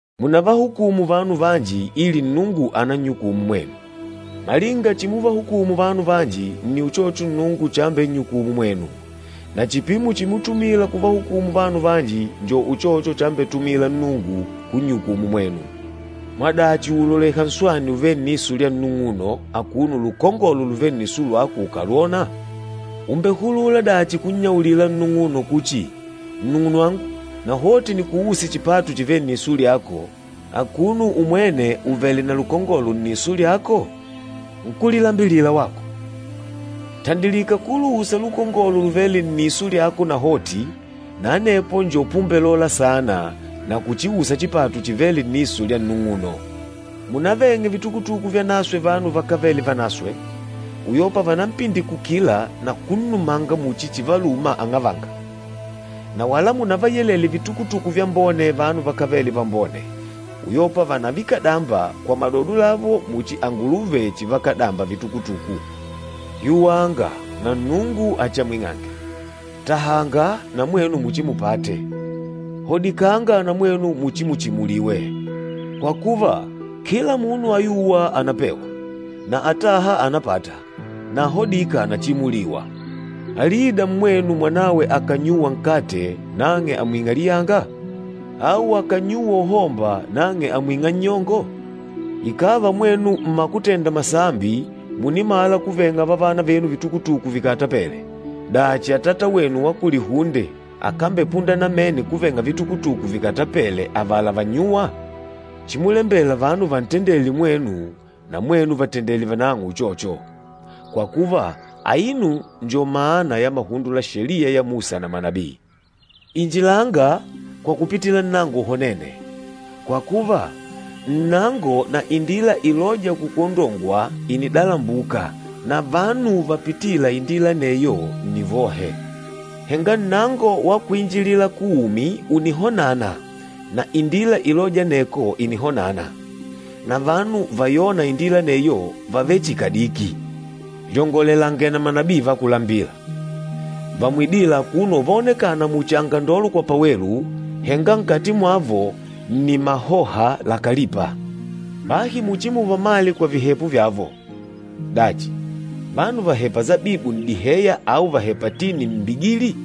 “Munavahukumu vanu vanji ili Nnungu anannyukumu mwenu. Malinga chimuvahukumu vanu vanji, nni uchocho Nnungu chambennyukumu mwenu, na chipimo chimutumila kuvahukumila vanu vanji njo uchocho chambetumila Nnungu kunnyukumu mwenu. Mwadachi ùuloleha nswani uvêle nniso lya nnung'uno, akuno lukongolo luvêle nniso lyako ukàlwònà? Ùmbehulula dachi kunnyaulila nnung'uno kuchi, ‘Nnung'unwangu, nahoti nikuuse chipatu chivêle nniso lyako,’ akuno umwene uvèlè na lukongolo nniso lyako? Nkúlilambilila wako! Tandilika kuluusa lukongolo luvêle nniso lyako nahoti, na anepo njo pumbelola saana na kuchiusa chipatu chivêle nniso lya nnung'uno. Munaveng'e vitukutuku vyanaswe vanu vakávele vanaswe, uyopa vanampindikukila na kunnumanga muchi chivaluma ang'avanga. Na wala munavayelele vitukutuku vyambone vanu vakávele vambone, uyopa vànavikadamba kwa madodo lavo muchi anguluve chivakadamba vitukutuku.” “Yuwanga, na Nnungu achiamwing'ange, tahanga na mwenu muchimupate, hodikanga na mwenu muchimuchimuliwe. Kwa kuva, kila munu ayûwa ànapewa, na atâha ànapata, na ahodîka ànachimuliwa. Alida mmwenu, mwanawe akànnyuwa nkate, nang'e àmwing'a liyanga? Au akànnyuwa uhomba, nang'e àmwing'a nnyongo? Ikàva mwenu mmakutenda masambi, mùnimala kuveng'a vavana venu vitukutuku vikatapele, dachi Atata wenu wa kulihunde akambepunda namene kuveng'a vitukutuku vikatapele avala vannyûwa? Chimulembela vanu vantendele mwenu, na mwenu vatendele vanang'o uchocho, kwa kuva, aino njo mana ya mahundo la Sheliya ya Musa na manabii.” “Injilanga kwa kupitila nnango uhonene, kwa kuva, nnango na indila ilôja kukuondongwa ìnidalambuka na vanu vapitîla indila aneyo, nni vohe. Henga nnango wa kwinjilila kuumi ùnihonana na indila ilôja aneko ìnihonana, na vanu vayôna indila aneyo vàvele chihi kadiki.” “Lyongolelange na manabii va kulambila. Vamwidîla akuno uvaonekana muchi angandolo kwa pawelu, henga nkati mwavo nni mahoha lakalipa. Bahi muchimuvamale kwa vihepo vyavo. Dachi, vanu vàhepa sabibu n'diheya au vàhepa tini mmbigili?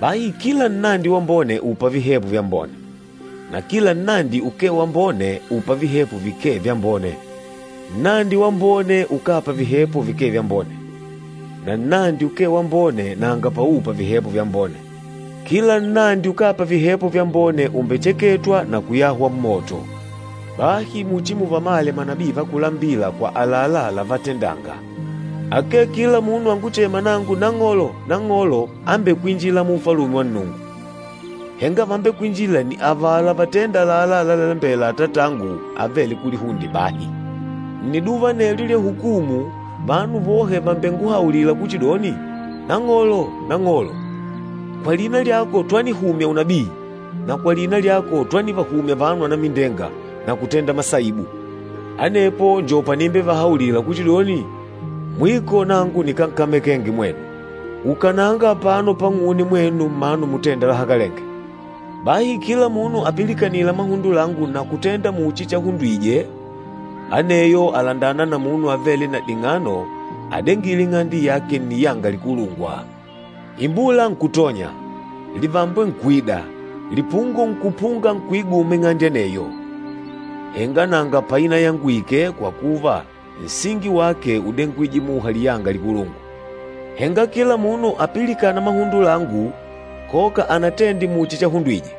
Bahi kila nnandi wambone ùpa vihepo vyambone, na kila nnandi ukee wambone ùpa vihepo vikee vyambone. Nnandi wambone ukápa vihepo vikee vyambone, na nnandi ukee wambone nanga paupa vihepo vyambone. Kila nnandi ukápa vihepo vyambone umbecheketwa na kuyahwa mmoto. Bahi muchimuvamale manabii va kulambila kwa àlalá lávatendânga. Akee kila munu anguchêma nangu, ‘Nang'olo, Nang'olo,’ ambekwinjîla mu Ufalume wa Nnungu, henga vambekwinjîla nni avala vatênda àlalá lalalembela Atatangu avêle kulihunde bahi. Nniduva anelyo lya hukumu, vanu vohe vàmbenguhaulila kuchidoni, ‘Nang'olo, Nang'olo! Kwa lina lyako twanihumya unabii, na kwa lina lyako twanivahumya vanu anamindenga na kutenda masaibu!’ Anepo njo panimbevahaulila kuchidoni, ‘Mwiko nangu nikánkamekenge mwenu! Ukananga apano pang'une, mwenu mmanu mutênda lahakalenge!’” “Bahi kila munu apilikanîla mahundo langu na kutenda muchi chahundwije, aneyo àlandana na munu avêle na ding'ano adengîle ing'ande yake nniyanga likulungwa. Imbula nkutonya, livambwe nkuida, lipungo nkupunga nkuiguma ing'ande aneyo. Henga nanga painayangwike kwa kuva nsingi wake údengwije muha liyanga likulungwa. Henga kila munu apilikâna mahundo langu, koka anatende muchi chahundwije,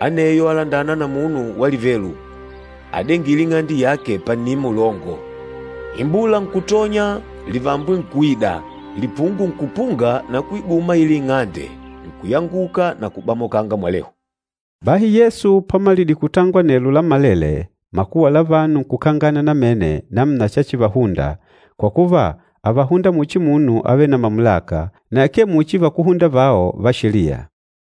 aneyo àlandana na munu walivelu, adengîle ing'ande yake pannima ulongo. Imbula nkutonya, livambwe nkuida, lipungo nkupunga na kuiguma aila ing'ande, nkuyanguka na kubamoka mwalehu.” Bahi Yesu pamalidile kutangola anelo lammalele, makuwa la vanu nkukangana namene namuna chachivahunda, kwa kuva, ávahunda muchi munu avêle na mamulaka, na akee muchi vakúhunda vao va Sheliya.